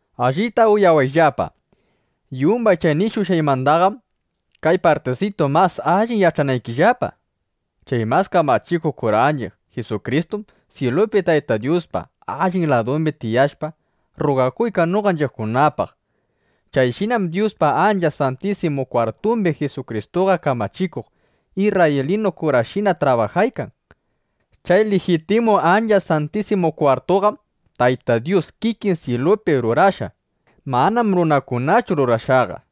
Allita uyawayllapa. Yumbay chay nishushqaymandaqam kay partisitu mas alli yach'anaykillapa: Chay mas kamachikuq kuranchiq Jisukristum syilupi Tayta Dyuspa allin ladumbi tiyashpa, rrugakuykan noqanchiqkunapaq. Chayshinam Dyuspa Ancha Santisimu Kwartumbi Jisukristuqa kamachikuq isrraylinu kurashina trabajaykan. Chay lijitimu Ancha Santisimu Kwartutaqam Tayta Dyus kikin syilupi rurashqa. Manam runakunachu rurashqaqa.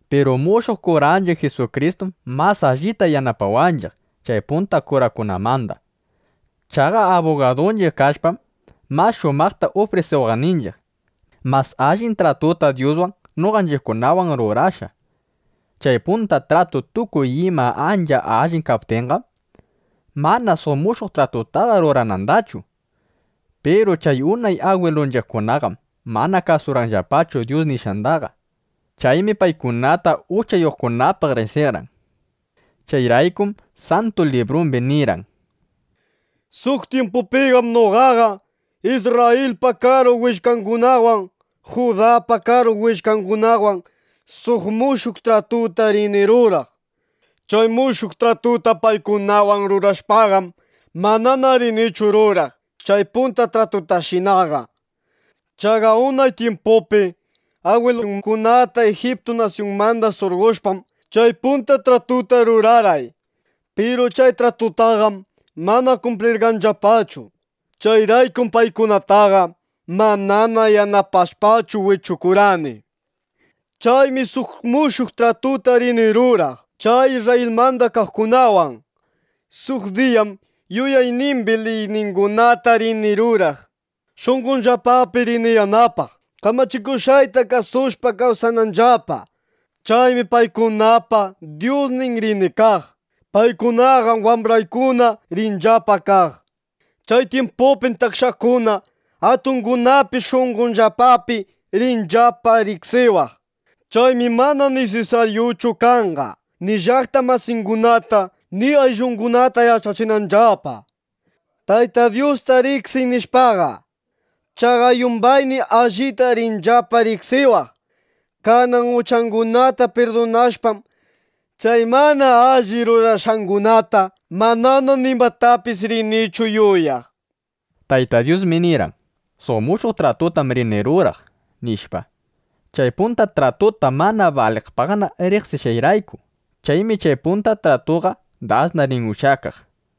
Piru mushuq kuranchiq Jisukristum mas allita yanapawanchiq chay punta kurakunamanda. Chaqa abugadunchiq kashpam, mas shumaqta ufrisiwaqninchiq, mas allin tratuta Dyuswan, noqanchiqkunawan rurashqa. Chay punta tratu tukuy imapi ancha allin kaptinqam, mana suq mushuq tratutaqa ruranandachu. Piru chay unay agwilunchiqkunaqam mana kasurqanllapachu Dyus nishqandaqa. Chaymi paykunata uchayuqkunapaq riqsirqan. Chayraykum Santu Librumbi nirqan: Suq tyimpupim noqaqa Isrrayilpa karu willkangunawan, Judapa karu willkangunawan suq mushuq tratuta rini ruraq. Chay mushuq tratuta paykunawan rurashpaqam, manana rinichu ruraq chay punta tratutashinaqa. Chaqa unay tyimpupi agwilungunata Ijiptu nasyunmanda surqoshpam, chay punta tratutaqa rurarqay. Piru chay tratutaqam mana kumplirqanllapachu. Chayraykum paykunataqa manana yanapashpachu wichukurqani. Chaymi suq mushuq tratuta rini ruraq chay Isrrayilmanda kaqkunawan. Suq diyam yuyaynimbi liyniykunata rini ruraq. Shunqonllapapi rini yanapaq, kamachikushqayta kasushpa kawsananllapa. Chaymi paykunapa Dyusnin rini kaq. Paykunaqam wambraykuna rinllapa kaq. Chay tyimpupim takshakuna, atungunapis shunqonllapapi rinllapa riqsiwaq. Chaymi mana nisisaryuchu kanqa, ni llaqta masingunata ni ayllungunata yach'achinanllapa: “Tayta Dyustar riqsiy”, nishpaqa. Chaqa yumbaymi allita rinllapa riqsiwaq. Kanan uchangunata pirdunashpam, chay mana alli rurashqangunata manana nimatapis rinichu yuyaq, nishpa. Tayta Dyusmi nirqan: “Suq mushuq tratutam rini ruraq” nishpa, chay punta tratuta mana baliqpaqna riqsishqanrayku. Chaymi chay punta tratuqa dasna rin ushyakaq.